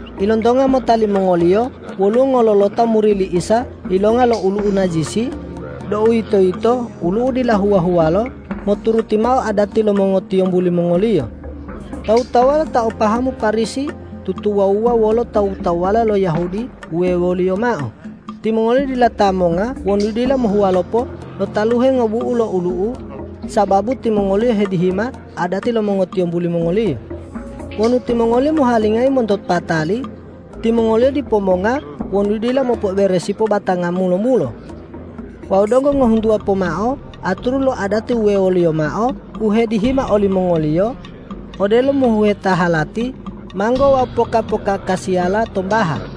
Ilontonga mota limongoliyo woluwo ngololota muri li Isa yilonga lo olu'u najisi, deuwitoyito olu'u dila huwa-huwalo moturuti mao adati lo mongotiyombu limongoliyo. Tawu-tawuwala ta o pahamu Parisi tutuwawuwa wolo tawu-tawuwala lo Yahudi wuwewoliyo mao, timongoliyo dila ta monga wonu dila mohuwalopo lo taluhe ngobu'u lo olu'u, sababu timongoliyo hedihima adati lo mongotiyombu limongoliyo. Wonu timongoliyo mohuwalingayi monto patali, timongoliyo dipo monga wonu dila mopo'oberesipo batanga mulo-mulo. Wawu donggo ngohuntuwa pomao aturu lo adati wuwewoliyo mao u hedihima olimongoliyo, odelo umohuheta halati, manggo wawu poka-pokakasiyala tombaha.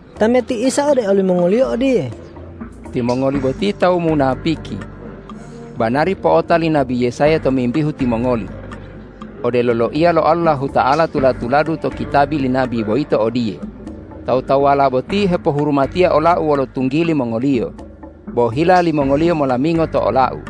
Tameti Isa ode olimongoliyo odiye,”Timongoli boti tawu munapiki. Banari po'ota li nabi Yesaya tomimbihu timongoli. Odelo loiya lo Allahuta'ala tula-tuladu to kitabi li nabi boyito odiye, ’Tawu-tawuwala boti hepohurumatiya ola-U wolo tunggili mongoliyo, bo hila limongoliyo molamingo to ola-U.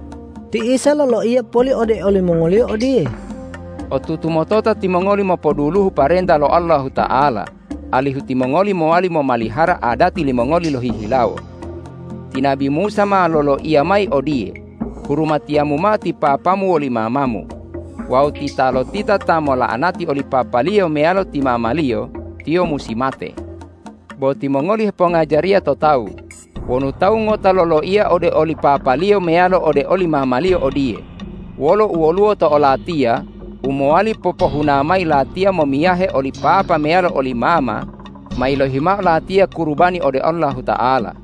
Ti Isa loloiya poli ode olimongoliyo odiye,”Otutu motota timongoli mopoduluhu parenta lo Allahuta'ala, alihu timongoli mowali momalihara adati limongoli lohihilawo. Ti nabi Musa ma loloiya mayi odiye: Hurumatiyamu mao ti papamu woli mamamu! wawu: Titalotita ta mola'anati oli papaliyo meyalo ti mamaliyo, tiyo musi mate. Bo timongoli hepongajariya to tawu, wonu tawu ngota loloiya ode oli papaliyo meyalo ode oli mamaliyo odiye, ’Wolo u woluwo to olatiya u mowali popohuna mayi latiya momiyahe oli papa meyalo oli mama ma yilohi mao latiya kurubani ode Allahuta'ala.’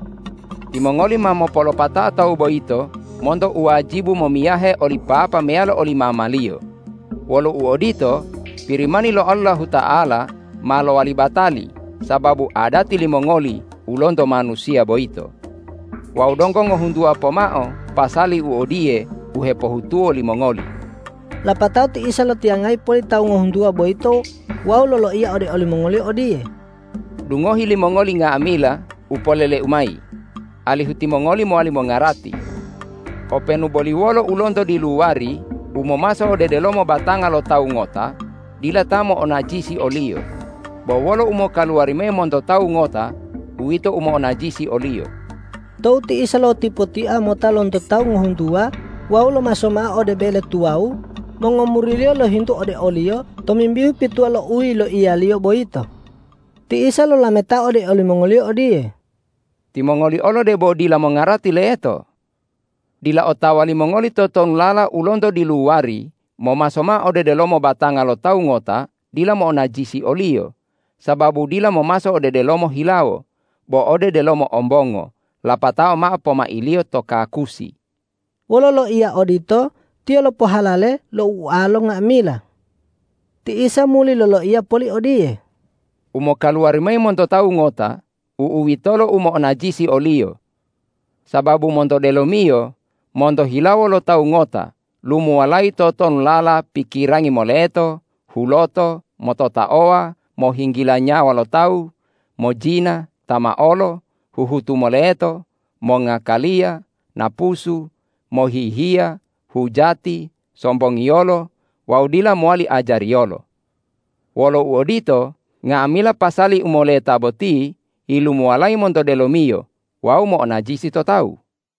Timongoli ma mopolopatao tawu boyito monto u wajibu momiyahe oli papa meyalo oli mamaliyo. Wolo uodito, Pirimani lo Allahuta'ala ma lowali batali sababu adati limongoli u lonto manusiya boyito. Wawu donggo ngohuntuwa pomao pasali u odiye u hepohutuwo limongoli.” Lapatao ti Isa lotiyangayi poli tawu ngohuntuwa boyito wawu loloiya ode olimongoliyo odiye,”Dungohi limongoli nga'amila u polele-U mayi, alihu timongoli mowali mongarati. Openu boli wolo u lonto diluwari, u momaso ode delomo batanga lo tawu ngota dila ta mo'onajisi oliyo, bo wolo u mokaluwari mayi monto tawu ngota uwito u mo'onajisi oliyo.” Tou ti Isa lotipotia mota lonto tawu ngohuntuwa wawu lomaso ma'a ode bele tuwawu, mongomuri-Liyo lohintu ode o-Liyo tomimbihu pituwa lo u yiloiya-Liyo boyito. Ti Isa lolametao ode olimongoliyo odiye,”Timongoli olo debo dila mongarati leto? Dila otawa limongoli totonulala u lonto diluwari momaso mao ode delomo batanga lo tawu ngota dila mo'onajisi oliyo, sababu dila momaso ode delomo hilawo, bo ode delomo ombongo, lapatao mao pomailiyo to kakusi.” Wolo loiya odito Tiyo lopohalale lo ualo nga'amila. Ti Isa muli loloiya poli odiye,”U mokaluwari mayi monto tawu ngota, u'uwitolo u mo'onajisi oliyo. Sababu monto delomiyo, monto hilawo lo tawu ngota lumuwalayi totonulala: pikirangi moleto, huloto, mototaowa, mohinggila nyawa lo tawu, mojina, tamaolo, huhutu moleto, mongakaliya, napusu, mohihiya, hujati, sombongiyolo wawu dila mowali ajariyolo. Wolo uodito, nga'amila pasali u moleta boti yilumuwalayi monto delomiyo wawu mo'onajisi to tawu.”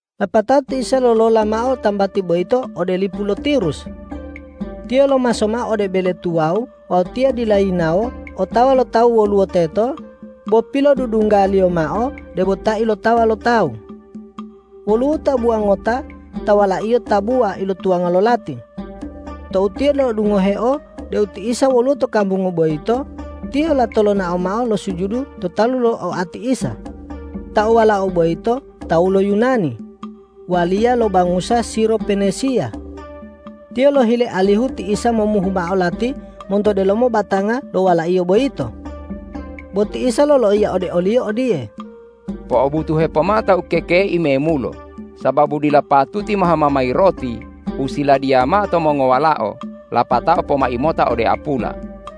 Lapatao ti Isa lolola mao tambati boyito ode lipu lo Tirus. Tiyo lomaso mao ode bele tuwawu wawu Tiyo dila yinawo otawa lo tawu woluwo teto, bo pilodudungga-Liyo mao debo ta ilotawa lo tawu. Woluwo tabuwa ngota ta walaiyo tabuwa ilotuwanga lo lati. Tou tiyo lo'odungoheo deu ti Isa woluwo to kambungu boyito, tiyo lato lonao mao losujudu to talu lo oati Isa. Ta o wala'a boyito tawu lo Yunani waliya lo bangusa Siro-Penesiya. Tiyo lohile alihu ti Isa momuhu mao lati monto delomo batanga lo walaiyo boyito. Bo ti Isa loloiya ode oliyo odiye,”Po'obutuhe pomao ta ukekei memulo, sababu dila patuti mohama mayi roti u siladiya mao to mongowalao lapatao pomai mota ode apula.”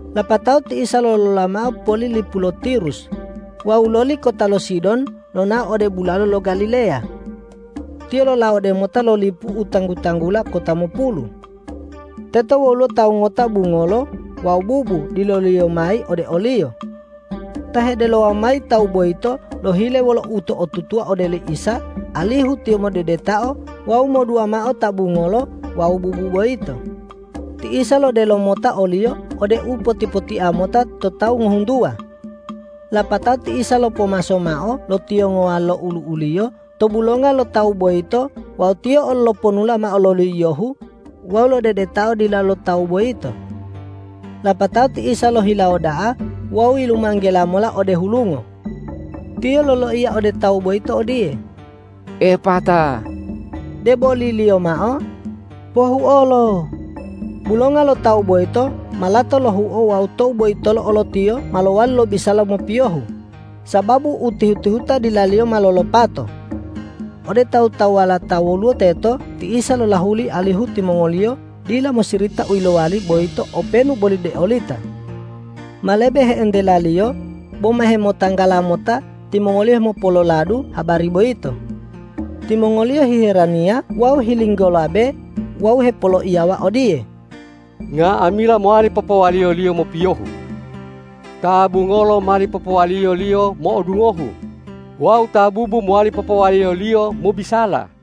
Lapatao ti Isa lolola mao poli lipu lo Tirus wawu loli kota lo Sidon lonao ode bulalo lo Galileya. Tiyo lolawode mota lo lipu u tanggu-tanggula Kota Mopulu. Teto woluwo tawu ngota bungolo wawu bubu dileloliyo mayi ode o-Liyo. Ta hedelowa mayi tawu boyito lohile wolo uto'otutuwa ode li Isa alihu Tiyo modedetao wawu modua mao ta bungolo wawu bubu boyito. Ti Isa lodelo mota oliyo ode u poti-potia mota to tawu ngohuntuwa. Lapatao ti Isa lopomaso mao lo tiyongowa lo olu'u-Liyo to bulonga lo tawu boyito wawu Tiyo olo loponula mao lo yiyohu wawu lodedetao dila lo tawu boyito. Lapatao ti Isa lohilawo da'a wawu yilumanggela mola ode hulungo. Tiyo loloiya ode tawu boyito odiye,”Epata!” deboliliyo mao: Pohuolo! Bulonga lo tawu boyito ma lato lohuo wawu tou boyitolo olo tiyo ma lowali lobisala mopiyohu, sababu u tihu-tihuta dilaliyo ma lolopato. Ode tawu-tawuwala ta woluwo teto ti Isa lolahuli alihu timongoliyo dila mosirita u yilowali boyito openu boli deolita. Ma lebe he'entela-Liyo, boma hemotanggala mota timongoliyo hemopololadu habari boyito. Timongoliyo hiheraniya wawu hilinggolabe wawu hepoloiyawa odiye,”Nga'amila mowali popowaliyo-Liyo mopiyohu. Ta bungolo mali popowaliyo-Liyo mo'odungohu wawu ta bubu mowali popowaliyo-Liyo mobisala.”